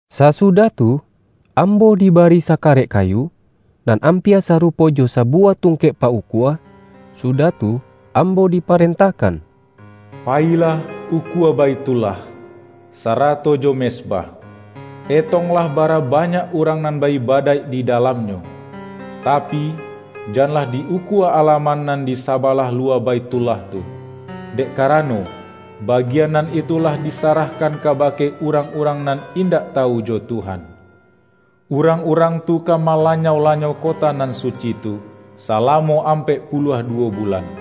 Sasudah tu, ambo dibari sakarek kayu, nan ampia sarupo jo sabuwah tungkek pa-ukua, sudah tu, ambo diparentahkan,”Payilah ukua Baithullah, sarato jo mezbah. Etonglah bara banyak urang nan ba-ibadaik di dalamnyo. Tapi, janlah di-ukua ala-man nan di sabalah luwa Baithullah tu, dek karano, bagian nan itu lah disarah-kan kabake urang-urang nan indak ta-wu jo Tuhan. Urang-urang tu ka mala-nyau-lanyau kota nan suci tu, salamo ampek puluah duwo bulan.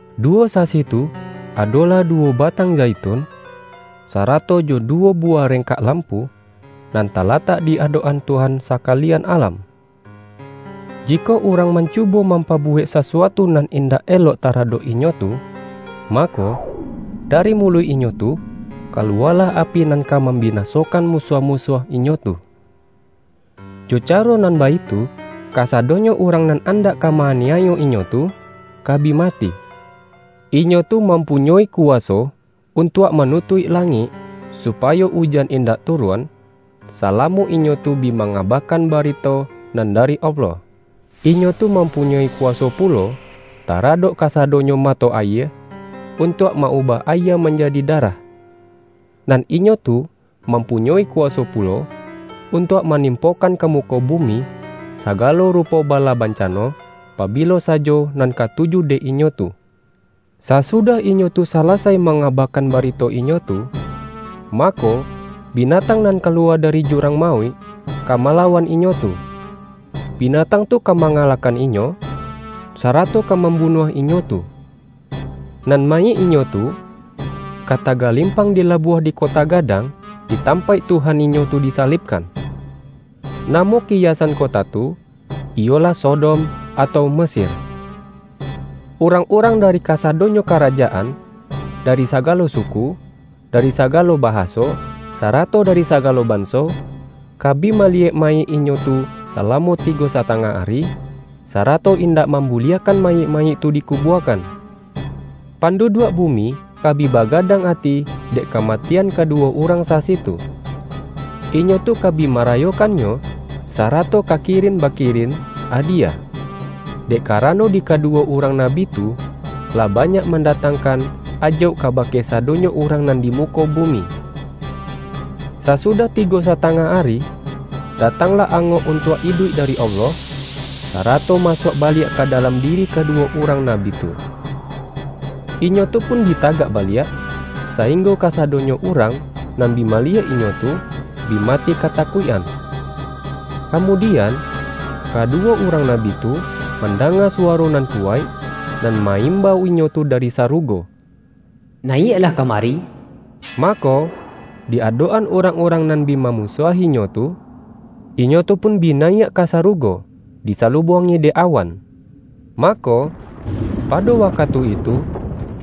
Duwo sasi tu, adolah duwo batang zaitun, sarato jo duwo buwah rengkak lampu, nan talatak di adok-an Tuhan sakalian alam. Jikok urang mancubo mampabuwek sasuatu nan indak elok taradok inyo tu, mako, da-ri muluik inyo tu kaluwalah api nan ka mambinasokan musuah-musuah inyo tu. Jo caro nan baitu, kasado-nyo urang nan andak ka ma-aniayo inyo tu, ka bi mati. Inyo tu mam-punyoi kuwaso untuak manutuik la-ngik, supayo ujan indak turun, sala-mo inyo tu bi mangabakan barito nan dari Allah. Inyo tu mampunyoi kuwa-so pulo taradok kasadonyo mato ayie, untuak ma-ubah ayie manjadi darah. Nan inyo tu mampunyoi kuwaso pu-lo, untuak manimpokan ka muko bu-mi sagalo rupo bala bancano, pabilo sajo nan katuju dek inyo tu. Sasudah inyo tu salasai mangaba-kan barito inyo tu, mako, binatang nan kaluwa dari jurang mauik, ka malawan inyo tu. Binatang tu ka mangalahkan inyo, sarato ka mambunuah inyo tu. Nan mayik inyo tu, ka tagalimpang di labuah di kota gadang, di tampaik Tuhan inyo tu disalibkan. Namo kiya-san kota tu, iyolah Sodom, atau Mesir. Urang-urang dari kasadonyo karaja-an, dari sagalo suku, dari sagalo baha-so, sarato dari sagalo banso, ka bi mali-yek mayik inyo tu salamo tigo satangah ari, sarato indak mambuliahkan mayik-mayik tu di kubuakan. panduduak bumi ka bi bagadang ati dek kamatian kaduwo urang sasi tu. Inyo tu ka bi ma-rayokannyo, sarato ka kirin bakirin adi-yah, dek karano di kaduwo urang nabi tu, lah banyak mandatangkan ajauk ka-bake sadonyo urang nan di muko bumi. Sasudah tigo satangah ari, datanglah angok untuak iduik dari Allah, sara-to masuak baliak ka dalam diri kadu-wo urang nabi tu. Inyo tu pun bi tagak baliak, sainggo kasadonyo urang nan bi maliyek inyo tu, bi mati katakuikan. Kamudian, kaduwo urang nabi tu, mandanga suwaro nan kuwaik, nan ma-imbau inyo tu dari sarugo,”Nayiak-lah kamari!” Mako, di adok-an urang-urang nan bi mamusuahi-nyo tu, inyo tu pun bi nayiak ka sarugo, disalu-buangi dek awan. Mako, pado wa-katu itu,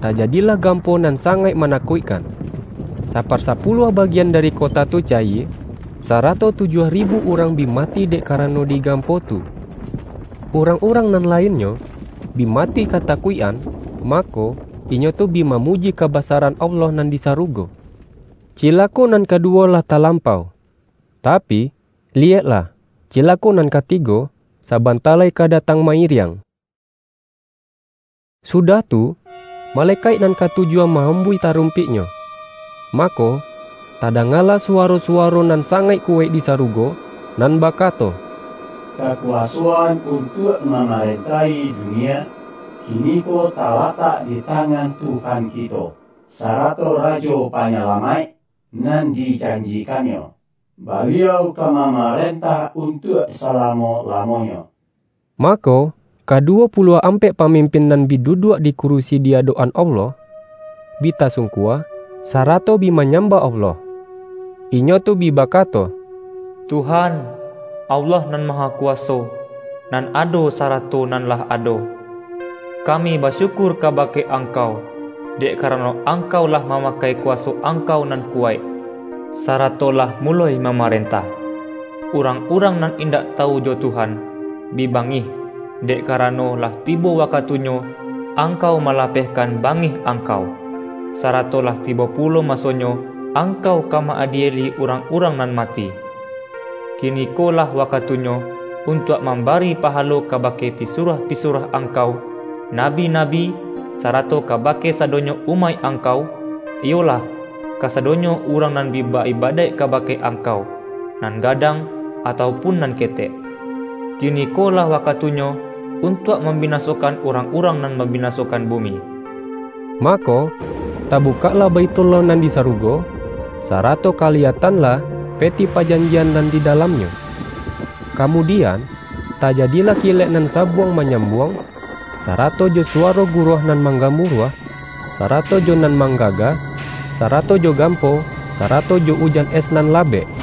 tajadilah gampo nan sangaik manakuikkan. Saparsapuluah bagian dari kota tu cayie, sarato tujuah ribu urang bi mati dek karano di gampo tu. Urang-urang nan lainnyo, bi mati kata-kuik-an, mako, inyo tu bi mamuji kaba-saran Allah nan di sarugo. Cilako nan kaduwo lah talampau. Tapi, liyeklah! Cilako nan katigo, sa-banta lai ka datang ma-iriang. Sudah tu, malekaik nan katujuah ma-ambuih tarumpiknyo, mako, ta-dangalah suwaro-suwaro nan sangaik kuwaik di sarugo, nan bakato,”Kaku-wasoan untuak mamarentahi dunia, kiniko talatak di tangan Tuhan kito, sarato Rajo Panyalamaik nan dijanji-kan-Nyo. Baliau ka mamarentah un-tuak salamo-lamonyo!” Mako, ka-duwo puluah ampek pamimpin nan bi duduak di kurisi di adok-an Allah, bi tasungkua, sarato bi manyambah Allah. Inyo tu bi bakato,”Tuhan, Allah nan Mahakuwaso, nan ado, sarato nan lah ado! Kami basyukur kabake Angkau, dek karano Angkau lah mamakai kuwaso Angkau nan kuwaik, sarato lah muloi mamarentah! Urang-urang nan indak tawu jo Tuhan, bi bangih, dek karano, lah tibo wakatunyo Angkau malapehkan bangih Angkau, sarato lah tibo pulo masonyo Angkau ka ma-adieli urang-urang nan mati. Kiniko lah wakatunyo, untuak mambari pahalo kabake pisuruah-pisuruah Angkau, nabi-nabi, sarato kabake sadonyo umaik Angkau, iyolah, kasadonyo urang nan bi ba-ibadaik kabake Angkau, nan gadang, atau pun nan ketek. Kiniko lah wakatunyo, untuak mambinasokan urang-urang nan mambinasokan bumi!” Mako, tabukaklah Baithullah nan di sarugo, sarato kaliyatanlah Peti Pa-janjian nan di dalamnyo. Kamudian, tajadilah kilek nan sabuang manya-buang, sarato jo suwaro guruah nan manggamuruah, sarato jo nan mang-gaga, sarato jo gampo, sarato jo ujan es nan labek.